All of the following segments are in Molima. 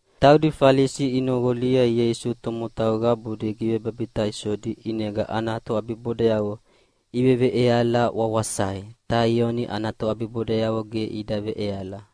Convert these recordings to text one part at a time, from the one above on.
Taudi Falisi inoqolia Ieisu tomotau qabudi givebabitaisodi ʼinega ana toʼabibodayavo iveveʼeala wawasai, ta Ioni ana toʼabibodayavo ge ida veʼeala.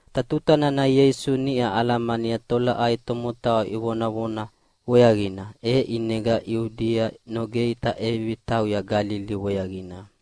Ta tuta nana Ieisu niʼa alamania tolaʼai tomotau ivonavona weaqina, e ʼinega Iudia nogei ta ʼevivi tauya Galili weaqina.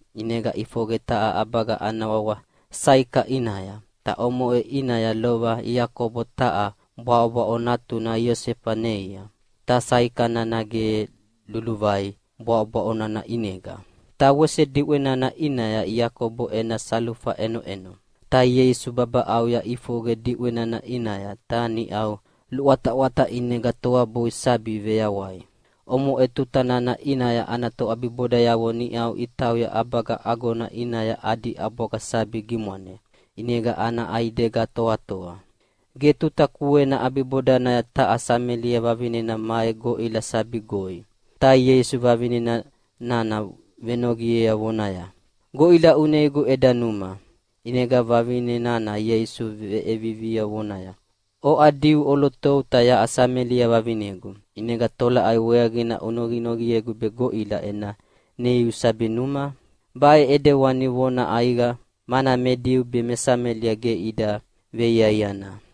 ʼinega ʼifoqe taha ʼabaga ana wawa Saika ʼinaya. Ta omoʼe ʼinaya lova Iakobo taha bwaʼobwaʼo natuna Iosefa neia, ta Saika nana ge luluvai bwaʼobwaʼo nana ʼinega. Ta wese diʼwe nana ʼinaya Iakobo ena salufa ʼenoʼeno. Ta Ieisu babaʼauya ʼifoqe diʼwe nana ʼinaya, ta niʼau luʼwataʼwata ʼinega toabui sabi veyawai. Omoʼe tuta nana ʼinaya ana toʼabibodayavo niʼau itauya ʼabaga agona ʼinaya adi ʼabwaga sabi gimwane, ʼinega ana ʼaidega toatoa. Ge tuta kuena ʼabibodanaya taha Samelia vavinena mai goʼila sabi goi. Ta Ieisu vavine nana venoqiea vonaya, “Goʼila uneigu eda numa!” ʼInega vavine nana Ieisu veʼiea vonaya, “Oʼa Diu ʼolotou ta yaʼa Samelia vavinegu, ʼinega tolaʼai weaqina unoqinoqiegu be goʼila ena neiu sabi numa?” (Baʼe ʼidewani vona ʼaiqa, mana me Diu be me Samelia ge ida veiaiana.)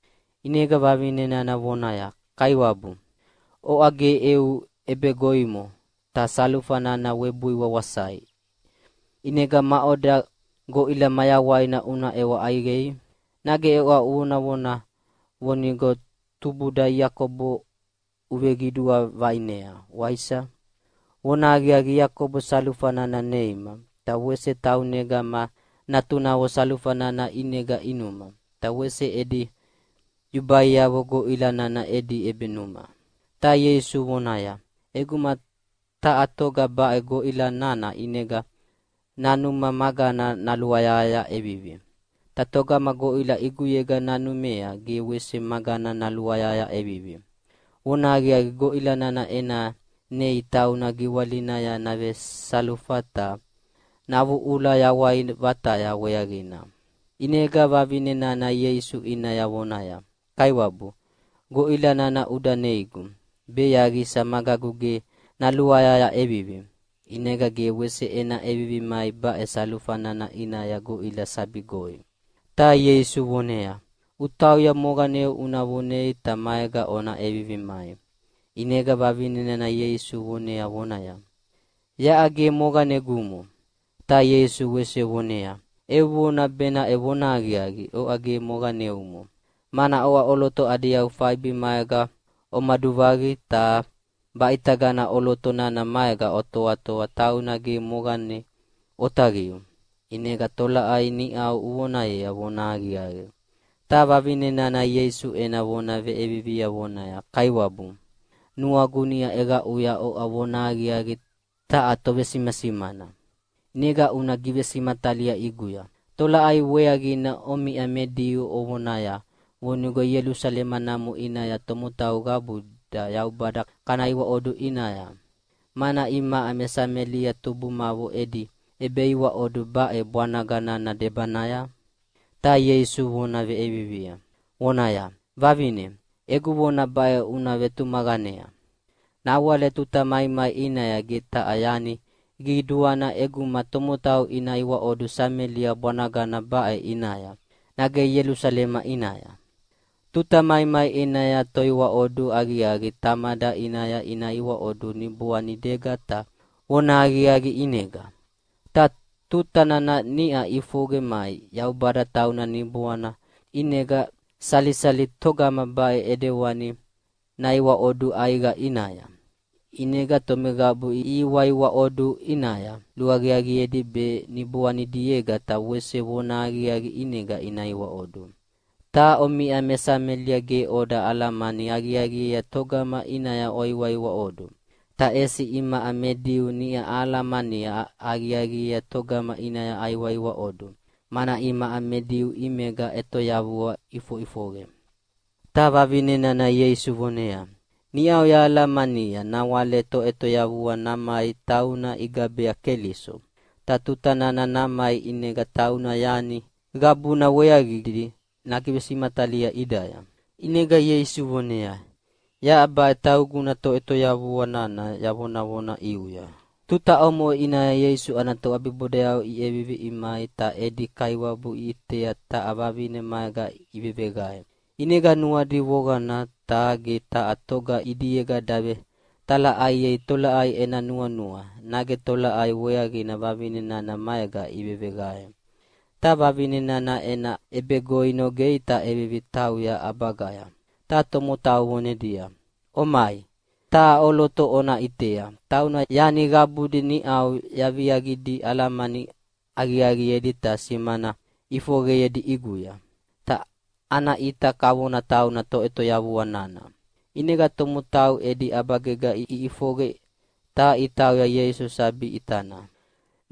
ʼInega vavine nana vonaya, “Kaiwabu, oʼa ge eu ʼebegoimo, ta salufa nana webui wawasai, ʼinega maʼoda goʼila mayawaina una ʼewa ʼaiqei? Nage oʼa uvonavona vonigo tubuda Iakobo uveqidua vaʼinea, waisa? Vonahaqiaqi, Iakobo salufa nana neima, ta wese taunega ma natunavo salufa nana ʼinega inuma, ta wese edi yubaiavo goʼila nana edi ʼebenuma.” Ta Ieisu voneaya, “ʼEguma taha toga baʼe goʼila nana ʼinega nanuma magana naluayahaya ʼevivi. Ta togama goʼila ʼiguyega nanumea ge wese magana naluayahaya ʼevivi. Vonahaqiaqi, goʼila nana ena neia tauna giwalinaya navesalufa ta navuʼuvuʼula yawai vataya weaqina.” ʼInega vavine nana Ieisu ʼinaya vonaya, “Kaiwabu, goʼila nana uda neigu, be yaqisa magagu ge naluayahaya ʼevivi, ʼinega ge wese ena ʼevivi mai baʼe salufa nana ʼinaya goʼila sabi goi.” Ta Ieisu voneaya, “Utauya moqaneu una vonei ta maega ona ʼevivi mai.” ʼInega vavine nana Ieisu vonea vonaya, “Yaʼa ge moqanegumo.” Ta Ieisu wese voneaya, “Eu vona benaʼe vonahaqiaqi, oʼa ge moqaneumo, mana oʼa ʼoloto adi yau faibi maega omaduvaqi, ta baʼitagana ʼoloto nana maega otoatoa tauna ge moqane otaqiu. ʼInega tolaʼai niʼau uvonayea vonahaqiaqi.” Ta vavine nana Ieisu ena vona veʼiea vonaya, “Kaiwabu, nuagu niʼa ʼeqaʼuya oʼa vonahaqiaqi taha tovesimasimana. ʼInega una givesimatalia ʼiguya, tolaʼai weaqina omiʼa me Diu ovonaya vonigo Ielusalema namo ʼinaya tomotau qabuda Yaubada kana iwaʼodu ʼinaya, mana imaʼa me Samelia tubumavo edi ʼebeiwaʼodu baʼe bwanaga nana debanaya?” Ta Ieisu vona ʼeviviea vonaya, “Vavine, egu vona baʼe una vetumaqanea. Nawale tuta maimai ʼinaya ge taha yani qiduana ʼeguma tomotau ina iwaʼodu Samelia bwanagana baʼe ʼinaya, nage Ielusalema ʼinaya. Tuta maimai ʼinaya toiwaʼodu aqiaqi Tamada ʼinaya ina iwaʼodu niboanidiega ta vonahaqiaqi ʼinega. Ta tuta nana niʼa ʼifoqe mai. Yaubada tauna Niboana, ʼinega salisali togama baʼe ʼidewani naiwaʼodu ʼaiqa ʼinaya. ʼInega tomeqabu ihiwaiwaʼodu ʼinaya, luaqiaqiedi be niboanidiega ta wese vonahaqiaqi ʼinega ina iwaʼodu. “Ta omiʼa me Samelia ge oda alamani aqiaqiea togama ʼinaya oiwaiwaʼodu, ta ʼesi imaʼa me Diu niʼa ahalamani aqiaqiea togama ʼinaya aiwaiwaʼodu, mana imaʼa me Diu ʼimega ʼetoyavua ʼifoʼifoqe.” Ta vavine nana Ieisu voneaya, “Niʼau yahalamania nawale Toʼetoyavua namai tauna igabea Keliso, ta tuta nana namai ʼinega tauna yani qabuna weaqidi nagivesimatalia ʼidaya.” ʼInega Ieisu voneaya, “Yaʼa baʼe tauguna Toʼetoyavua nana yavonavona ʼiuya.” Tuta omoʼe ʼinaya Ieisu ana toʼabibodayavo iʼevivi imai ta edi Kaiwabu iʼitea taha vavine maega iveveqae. ʼInega nuadi voqana, ta ge taha toga ʼidiega davetalaʼaiei tolaʼai ena nuanua, nage tolaʼai weaqina vavine nana maega iveveqae. Ta vavine nana ena ʼebegoi nogei ta ʼevivi tauya ʼabagaya, ta tomotau vonedia, “Omai, taha ʼoloto ona ʼitea, tauna yani qabudi niʼau yaviaqidi alamani aqiaqiedi ta simana ʼifoqeyedi ʼiguya. Ta ana ʼita kavona tauna Toʼetoyavua nana.” ʼInega tomotau edi ʼabagega iʼifoqe ta itauya Ieisu sabi ʼitana.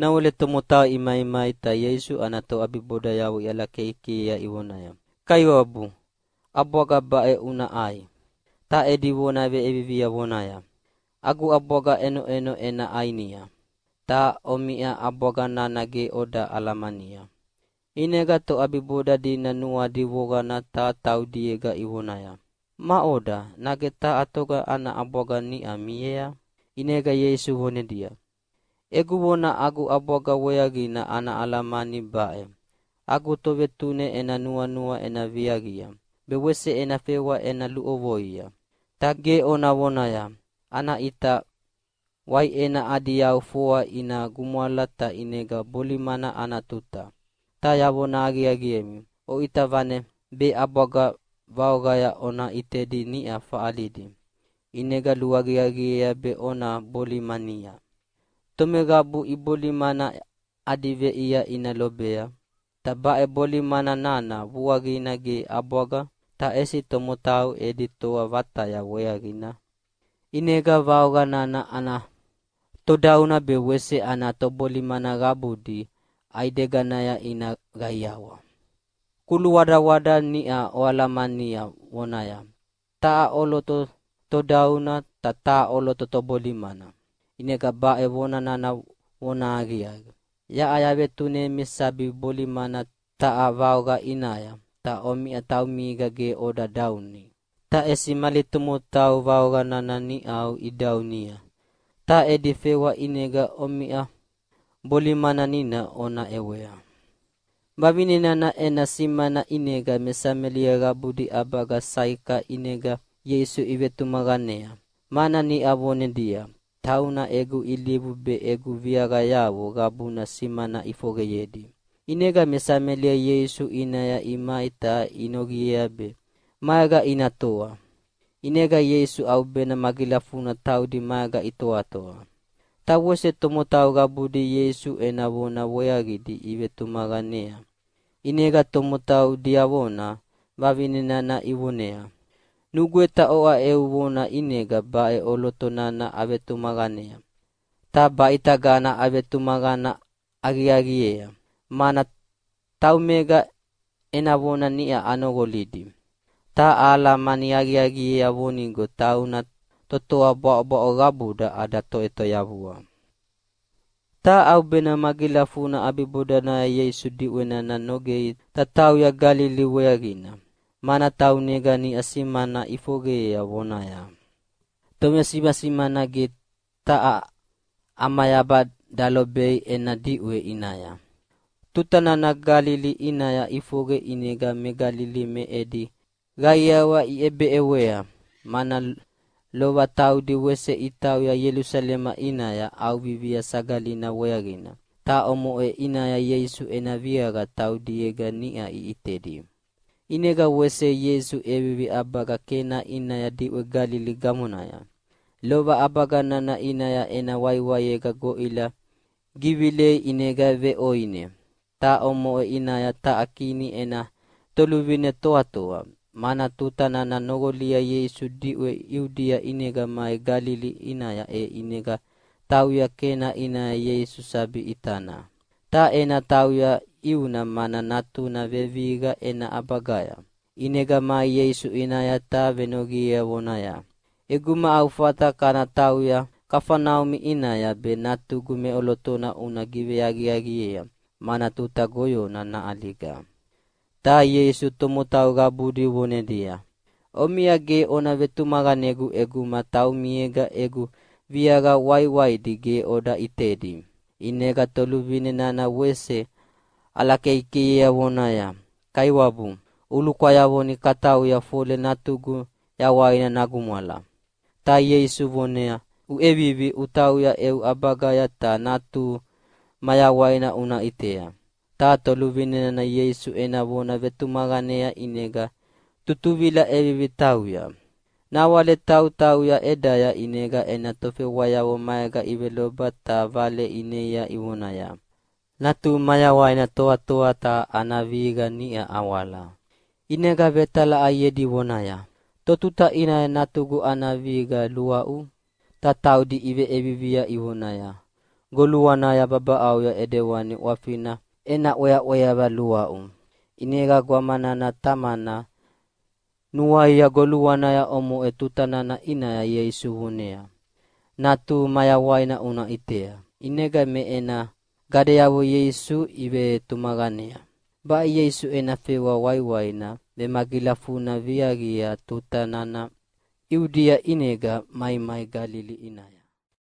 Nawale tomotau imaimai ta Ieisu ana toʼabibodayavo iʼalakeikeiea ivonaya, “Kaiwabu, ʼabwaga baʼe una ʼai!” Ta edi vona veʼevivia vonaya, “Agu ʼabwaga ʼenoʼeno ena ʼainia, ta omiʼa ʼabwaga nana ge oda alamania.” ʼInega toʼabiboda dina nuadi voqana ta taudiega ivonaya, “Maʼoda, nage taha toga ana ʼabwaga niʼa miea?” ʼInega Ieisu vonedia, “Egu vona agu ʼabwaga weaqina ana alamani baʼe: Agu Tovetune ena nuanua ena viaqia, be wese ena fewa ena luʼovoia. Ta ge ona vonaya, ‘Ana ʼita waiʼena adi yau foa ina gumwala ta ʼinega bolimana ana tuta.’ Ta yavona aqiaqiemi, oʼita vane be ʼabwaga vaoqaya ona ʼitedi niʼa faʼalidi, ʼinega luaqiaqiea be ona bolimania. Tomeqabu ibolimana adi veʼia ina lobea. Ta baʼe bolimana nana vuaqina ge ʼabwaga, ta ʼesi tomotau edi toa vataya weaqina. ʼInega vaoqa nana ana todauna be wese ana tobolimana qabudi ʼaideganaya ina qaiawa. Kuluwadawada niʼa oalamania vonaya, ‘Taha ʼoloto todauna, ta taha ʼoloto tobolimana.’ ʼInega baʼe vona nana vonahaqiaqi! Yaʼa yavetunemi sabi bolimana taha vaoqa ʼinaya, ta omiʼa taumiega ge oda dauni, ta ʼesi mali tomotau vaoqa nana niʼa idaunia, ta edi fewa ʼinega omiʼa bolimanina ona ʼewea.” Vavine nana ena simana ʼinega Me Samelia qabudi ʼabaga Saika ʼinega Ieisu ivetumaqanea, mana niʼa vonedia, “Tauna egu ilivu be egu viaqayavo qabuna simana ʼifoqeyedi.” ʼInega me Samelia Ieisu ʼinaya imai ta inoqiea be maega ina toa. ʼInega Ieisu ʼaubena magilafuna taudi maega itoatoa. Ta wese tomotau qabudi Ieisu ena vona weaqidi ivetumaqanea. ʼInega tomotau diavona vavine nana ivoneaya, “Nugweta oʼa eu vona ʼinega baʼe ʼoloto nana avetumaqanea, ta baʼitagana avetumaqana aqiaqiea, mana taumega ena vona niʼa anoqolidi. Ta ahalamani aqiaqiea vonigo tauna totoa bwaʼobwaʼo qabuda ada Toʼetoyavua.” Ta ʼaubena magilafudina ʼabibodanaya Ieisu diʼwe nana nogea ta tauya Galili weaqina, mana taunega niʼa simana ʼifoqeyea vonaya, “Tovesimasimana ge taha ʼamayaba dalobei ena diʼwe ʼinaya.” Tuta nana Galili ʼinaya ʼifoqe ʼinega me Galili me edi qaiawa iʼebeʼewea, mana lova taudi wese itauya Ielusalema ʼinaya ʼAuvivia Sagalina weaqina, ta omoʼe ʼinaya Ieisu ena viaqa taudiega niʼa iʼitedi. ʼInega wese Ieisu ʼevivi ʼabaga Kena ʼinaya diʼwe Galili gamonaya. Lova ʼabaga nana ʼinaya ena waiwaiega goʼila givilei ʼinega veʼoine. Ta omoʼe ʼinaya taha kini ena toluvine toatoa, mana tuta nana noqolia Ieisu diʼwe Iudia ʼinega mai Galili ʼinaya e ʼinega tauya Kena ʼinaya Ieisu sabi ʼitana. Ta ena tauya ʼiuna mana natuna vevihiqa ena ʼabagaya. ʼInega mai Ieisu ʼinaya ta venoqiea vonaya, “ʼEguma au fata kana tauya Kafaneumi ʼinaya be natugu meʼolotona una giveaqiaqiea, mana tuta goyona naʼaliga.” Ta Ieisu tomotau qabudi vonedia, “Omiʼa ge ona vetumaqanegu ʼeguma taumiega egu viaqa waiwaidi ge oda ʼitedi.” ʼInega toluvine nana wese ʼalakeikeiea vonaya, “Kaiwabu, ulukwayavoni katauya fole natugu yawaina nagumwala.” Ta Ieisu voneaya, “Uʼevivi utauya eu ʼabagaya ta natuhu mayawaina una ʼitea.” Ta toluvine nana Ieisu ena vona vetumaqanea ʼinega tutuvila ʼevivi tauya. Nawale tautauya ʼedaya ʼinega ena tofewayavo maega iveloba ta vale ineia ivonaya, “Natuhu mayawaina toatoa ta ana vihiqa niʼa awala.” ʼInega vetalaʼaiedi vonaya, “Totuta ʼinaya natugu ana vihiqa luaʼu?” Ta taudi iveʼiea ivonaya, “Goluanaya babaʼauya ʼidewani ʼwafina ena ʼweaʼweava luaʼu.” ʼInega gwama nana tamana nuaia goluanaya omoʼe tuta nana ʼinaya Ieisu voneaya, “Natuhu mayawaina una ʼitea.” ʼInega me ena gadeavo Ieisu ivetumaqanea. Baʼe Ieisu ena fewa waiwaina vemagilafuna viaqia tuta nana Iudia ʼinega maimai Galili ʼinaya.